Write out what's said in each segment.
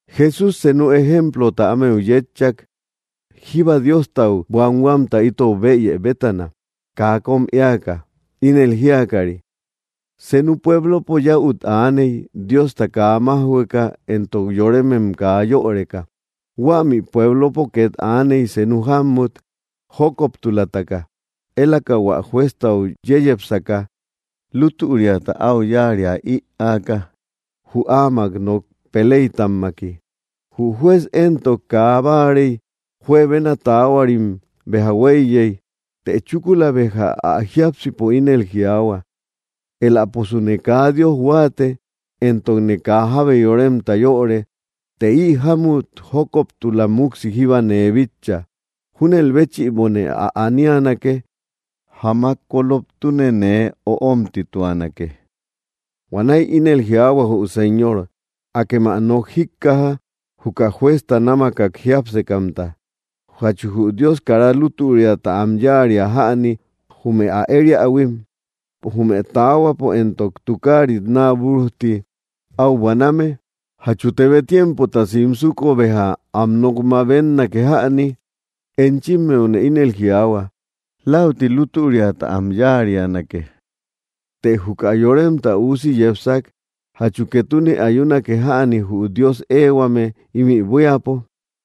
Jesús senu ejemplota ámeu yétchak, jíba Diostau buanhuamta itou bëyë bétana, kaa kóm éaka, ínel jíakari: —Senu pueblopo yäut aaney, Diosta kaa májhueka éntok yoremem kaa yöreka. Huämi pueblopo két aaney, senu jámut jókoptulataka, élaka hua jueztau yeyepsaka, lútüriata áu yáaria ïaaka jü áamak nok peleytamtamaki. Jü juez éntok kaa báarey; juebena taahuarim béja huéiyey. Të chúkula béja ä jiápsipo ínel jiaahua: “Éläposune kaa Dios huáate, éntokne kaa jábe yoremta yöre, të ï jámut jókoptula múksi jíba nee bitcha. Júnel béchïbone ä anianake, jamak koloptune nee öomtituanake.” Huanäi ínel jiaahua jü Señor: —Akem ä nok jíkkaja, juka juezta námakak jiápsekamta. ¿Jachu jü Dios kara lútüriata am yáaria jäni jume ä ëriähuim, jume taahuapo éntok tukaarit naa búrujti áu buaname? ¿Jachu tebe tiempota simsuko, béja am nok mabetnake jäni? Enchimmeune inel jiaahua läuti lútüriata am yáarianake. Të juka Yoremta Üusi yepsak, ¿jachu ketune ayunake jäni jü Dios eehuame ímï buíapo?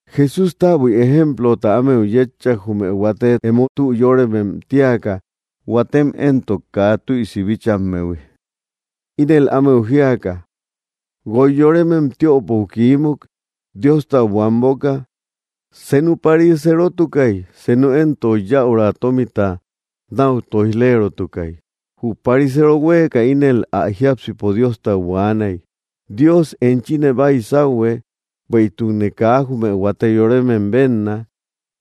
Jesús täbui ejemplota ámeu yétchak, jume huate emo tü yóremem tíaka, huatem éntok kaa tüisi bíchammehui. Ínel ámeu jiaka: —Guoy yoremem tiöpou kiímuk, Diostau buanboka. Senu pariserotukay, senu éntok yäura tómita náu tóij‑lerotukay. Jü pariseero huéeka ínel ä jiápsipo Diostau buaanay: “Dios, enchine baysauhue bueïtukne kaa jume huate yoremem bénna;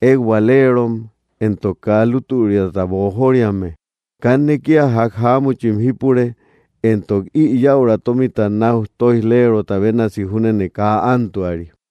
ékbualerom, éntok kaa lútüriata boojoriame. Kanne kía ják jáamuchim jípure, éntok ï yäura tómita náu tóij‑lerota bénasi júnene kaa ántuari.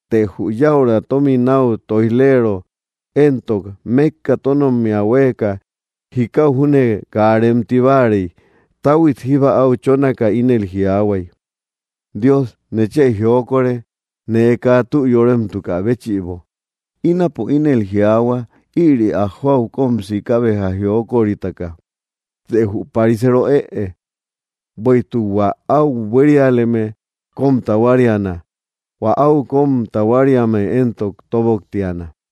Të jü yäura tómita náu tóij‑leero éntok, mékka tónommia huéeka, jikau júne kaa remti báarey. Táhuit jíba áu chónaka, ínel jiaahuay: “Dios, nechë jiokore, nee kaa tü yóremtukä béchïbo.” Ínapo ínel jiaahua ïri ä jóau kóm siika béja jiokoritaka, të jü pariseero ëe. Bueïtuk hua áu buérialeme kóm tahuariana; hua áu kóm tahuariame éntok tóboktiana.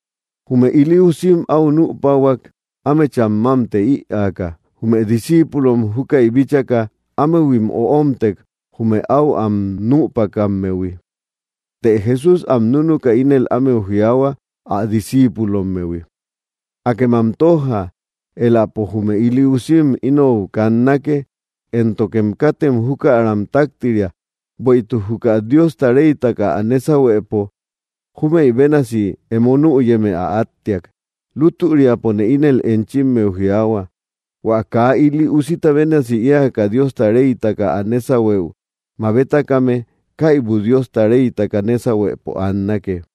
Jume ili usim áu nüpahuak, ámecham mámte ïaaka. Jume discíipulom, júkäi bíchaka, ámehuim öomtek, jume áu am nüpakammehui. Të Jesús am núnuka ínel ámeu jiaahua, ä discíipulommehui: —Akem am tójja, éläpo jume ili usim inou kannake, éntokem katem jukaram taktiria; bueïtuk juka Diosta reytaka ä nésahuepo júmëi bénasi emo nüyeme ä áttiak. Lútüriapone ínel enchimmeu jiaahua, hua kaa ili usita bénasi éaka Diosta reytaka ä nésahueu mabetakame, kaibu Diosta reytaka nésahuepo annake.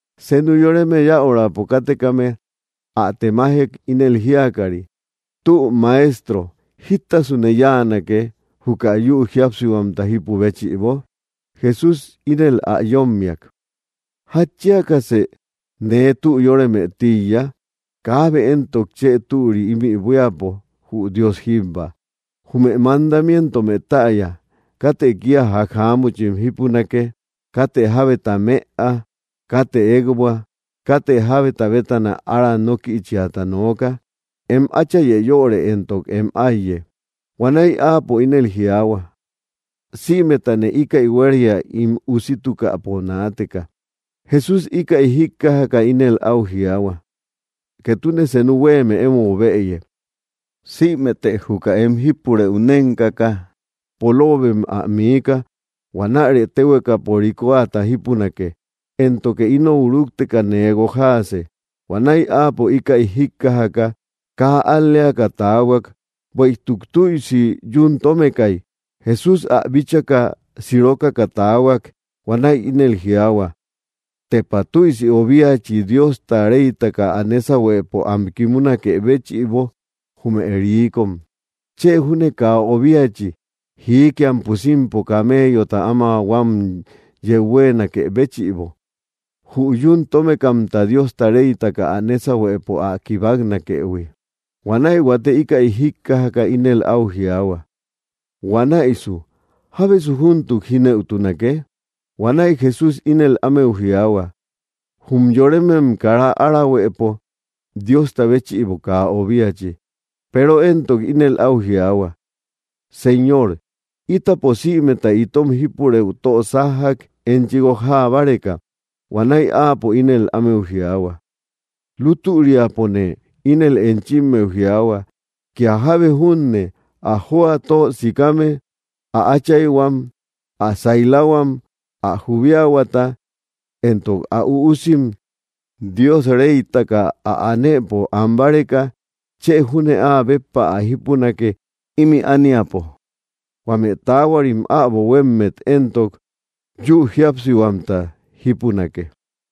Senu yoreme yäurapo kátekame ä temajek, ínel jíakari: —Tü Maestro, ¿jítasune yáanake, juka yü jíapsihuamta jípu béchïbo? Jesús ínel ä yómmiak: —¿Jatchiakasë nee tü yóreme tíiya? Kaabe éntok chë türi ímï buíapo, jü Dios jíbba. Jume mandamientomë täya: “Katë kía ják jáamuchim jípunake; katë jábeta mëa; katë ékbua; katë jábeta bétana ára nókïchiata nooka; em áchayë yöre, éntok em áiye.” Huanäi áapo ínel jiaahua: —Sïmetane íkäi huéria ín usitukäpo naateka. Jesús íkäi jíkkajaka ínel áu jiaahua: —Ketune senu huéeme émou bëye: sïmete juka em jípurëu nénkaka, poloobem ä miika; huanäre téhuekapo rikoata jípunake; éntoke inou rúkteka nee guojaase. Huanäi áapo íkäi jíkkajaka kaa al‑leaka taahuak, bueïtuk tüisi yún tómekay. Jesús ä bíchaka, siirokaka taahuak. Huanäi ínel jiaahua: —¡Tepa tüisi obiachi Diosta reytaka ä nésahuepo am kimunakë béchïbo, jume riikom! Chë júne kaa obiachi jiikia pusimpo camellota áma huam yeu huéenakë béchïbo, jü yún tómekamta Diosta reytaka ä nésahuepo ä kibaknakëhui. Huanäi huate íkäi jíkkajaka, ínel áu jiaahua: —Huanäisu, ¿jábesu júntuk jínëutunake? Huanäi Jesús ínel ámeu jiaahua: —Jum yoremem kara árahuëpo, Diosta béchïbo kaa obiachi. Peero éntok ínel áu jiaahua: —Señor, ítapo sïmeta itom jípurëu tö sájjak, enchi guojaa báreka. Huanäi áapo ínel ámeu jiaahua: —Lútüriapone ínel enchimmeu jiaahua, kía jábe júne ä jóa tö sikame, ä áchayhuam, ä sailahuam, ä jubiahuata, éntok ä üusim, Dios reytaka ä anëpo an báreka, chë júne áa béppa ä jípunake ímï ániapo; huame taahuarim äbo huémmet éntok, yü jíapsihuamta jípunake.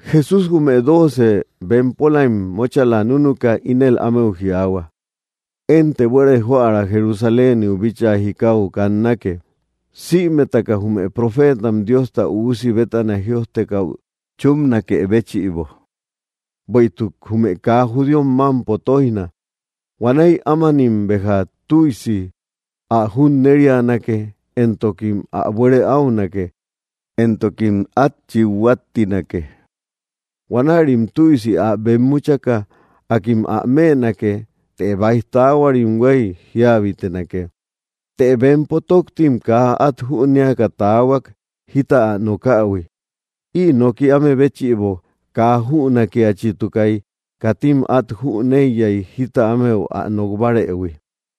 Jesús jume doocem bempolaim móchala núnuka, ínel ámeu jiaahua: —Énte buere joära Jerusaléniu bíchaa jikau kannake, sïmetaka jume profeetam Diosta Üusi bétana jïojtekäu chúpnakë béchïbo. Bueïtuk jume kaa judíom mámpo tóijna. Huanäi ámanim béja tüisi ä junnerianake, éntokim ä buere áunake, éntokim át chít huáttinake. Huanärim tüisi ä bemmuchaka, akim ä mënake; të báij taahuarim huéy jíabitenake. Të bempo tóktim kaa át jünéaka taahuak, jita ä nokähui. Ï noki áme béchïbo kaa jünakiachitukay; katim át jüneiyay jita ámeu ä nok bárëhui.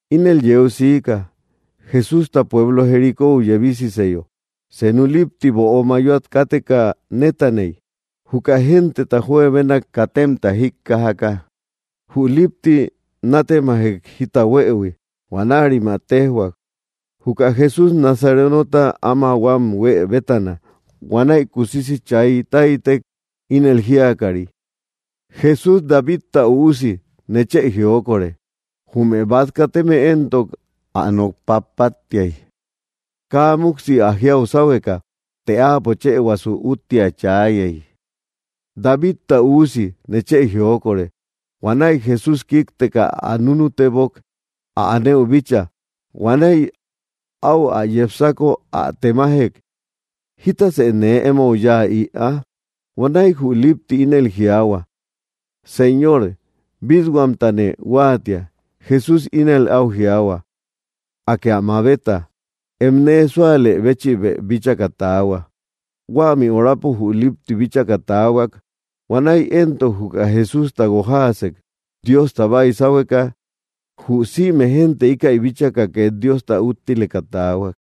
Ínel yeu siika: Jesústa pueblo Jericóu yebisiseyo, senu lípti böo mayoat káteka nétaney. Juka genteta juebenak katemta jíkkajaka, jü lípti nátemajek jita huëhui. Huanärim ä téjhuak, juka Jesús Nazarenota áma huam huë bétana. Huanäi kusisi chay táytek, ínel jíakari: —¡Jesús, Davidta Üusi, nechë jiokore! Jume bát kateme éntok ä nok pappattiay, kaa múksi ä jiau sáhueka. Të áapo chëhuasu úttia chaayey: —¡Davidta Üusi, nechë jiokore! Huanäi Jesús kíkteka ä núnutebok, ä anëu bíchaa. Huanäi áu ä yepsako, ä temajek: —¿Jítasë nee émou yáa ïa? Huanäi jü lipti ínel jiaahua: —Señor, bít-huamtane huáatia. Jesús ínel áu jiaahua: —¡Akë ä mabeta! Em nee súalë béchïbë bíchaka taahua. Huämi horapo jü lípti bíchaka taahuak. Huanäi éntok juka Jesústa guojaasek, Diosta baysahueka. Jü sïme génte íkäi bíchaka két Diosta úttileka taahuak.